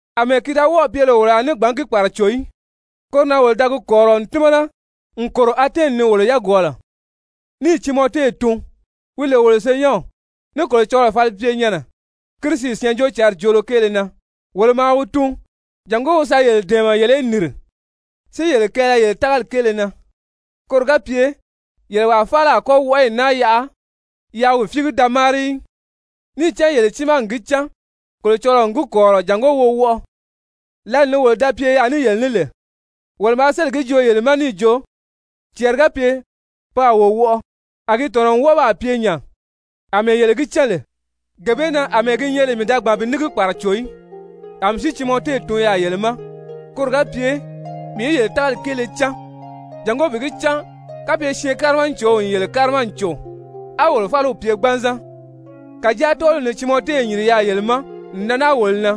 Amɛɛ ki da wɔ́ɔ̀ pye lè wolo a gbǎn ní gi kpàraco í, koro na wolo da gi kɔ̀rirɔ n tímana n kòro Atɛni ni wolo yagwɔɔlɔ, níì Timɔte tun, wi lè wolo senyɛnw ní Kolocɔlɔɔ falipyenyɛnnɛ Kirisi Syɛɛnjóocǎnri joolo kéele na, wolo maa wi tun jàngó wi sa yele dɛ̀ɛmɛ yele í nìri, si yele kɛɛlɛ yele tágali kéele na, koro ga pye yele wàa faala a kɔ́ wɔʔɔyi naa yaʔa yaa wi fíigi da máari í. Níì cán yele tiimaa n gi cán Kolocɔlɔɔ n gi kɔ̀rirɔ jàngó wo wɔʔɔ. Lǎli ni wolo da pye yaà ní yele ní lè, wolo maa sélì gi joo yele ma níì jo, cɛɛri ga pye pe a wo wɔʔɔ, a gi tɔ̀nɔ n wɔ́ɔ baa pye nya àmɛɛ yele gi cán lè. Gee bee na àmɛɛ gi nyɛ lè mii da gbàn bi ní gi kpàraco í, a mii si Timɔte tun yaà yele ma koro ga pye mii í yele tágali kéele cán, jàngó bi gi cán kapye syɛɛnkárimacow n yele kárima n cò á wolo fáliw pye gbanzan. Kàjáa tɔ́ɔliw ni Timɔte n yìri yaà yele ma n nan naa wolo na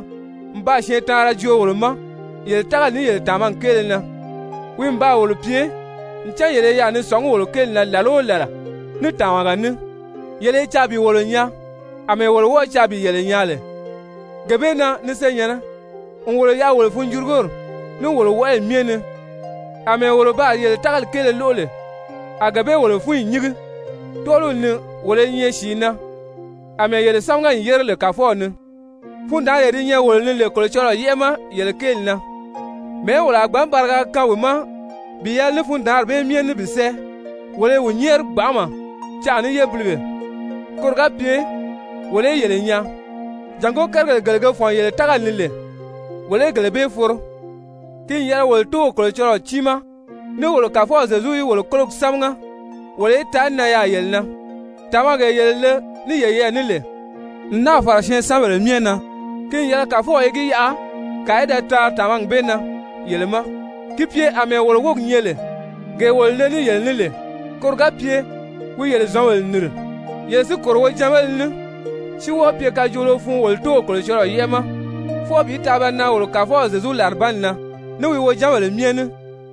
n baa syɛɛntaanra joo wolo ma yele tágali ní yele tàmagi kéele na. Wi n baa wolo pye, ncan yele i yaà ni sɔ̀ngí wolo kéeli na làla o làla ní tàmaga ní, yele i caa bi wolo nyaa àmɛɛ wolo wɔ́ɔ̄ caa bi yele nyaa lè. Gee bee na, ni senyɛ̀nnɛ, n wolo yaʔa wolo funjurugori, ní wolo wɔʔɔyi myɛ ni, àmɛɛ wolo baa yele tágali kéele lóʔo lè a gee bee wolo fúnyi nyíngi. Tɔ́ɔliw ni wolo i nyɛ sìi na, àmɛɛ yele sámaga n yére lè Kàfɔw ni. Fundaanree di nyɛ wolo ni lè Kolocɔlɔɔ yɛ́ʔɛ ma yele kéeli na, mɛ̀ɛ́ wolo a gbǎn bariga kaan wi ma bi yɛlɛ ní fundaanri bee myɛ ní bi sɛ́ɛ? Wolo i wi nyɛ́ɛri gbanʔama canʔa ní yébilige koro ga pye wolo í yele nyaa, jàngó kérigèle gele ge fɔ̀n yele tágali ni lè wolo í gele bee foro. Ki n yɛlɛ wolo Tóow Kolocɔlɔɔ tiimaa, ní wolo Kàfɔw Zyezu í wolo kólogi sámaga wolo í taa nan yaà yele na! Tàmagee yele le ní yeyɛɛ ní lè n náà fàra syɛɛnsanbèle myɛ na, ki n yɛlɛ Kàfɔw í gi yaʔa kàa í da taari tàmagi bee na yele ma ki pye àmɛɛ wolo wógi nyɛ lè gee wolo le ní yele ní lè. Koro ga pye wi yele zɔ̌nbèle nìri yele si kòro wojanbéle ní, si wɔ́ɔ pye kajoolo fun wolo Tóow Kolocɔlɔɔ yɛ́ʔɛ ma fwɔɔ bi taa ba nan wolo Kàfɔw Zyezu làribanni na ní wi wojanbèle myɛ ní!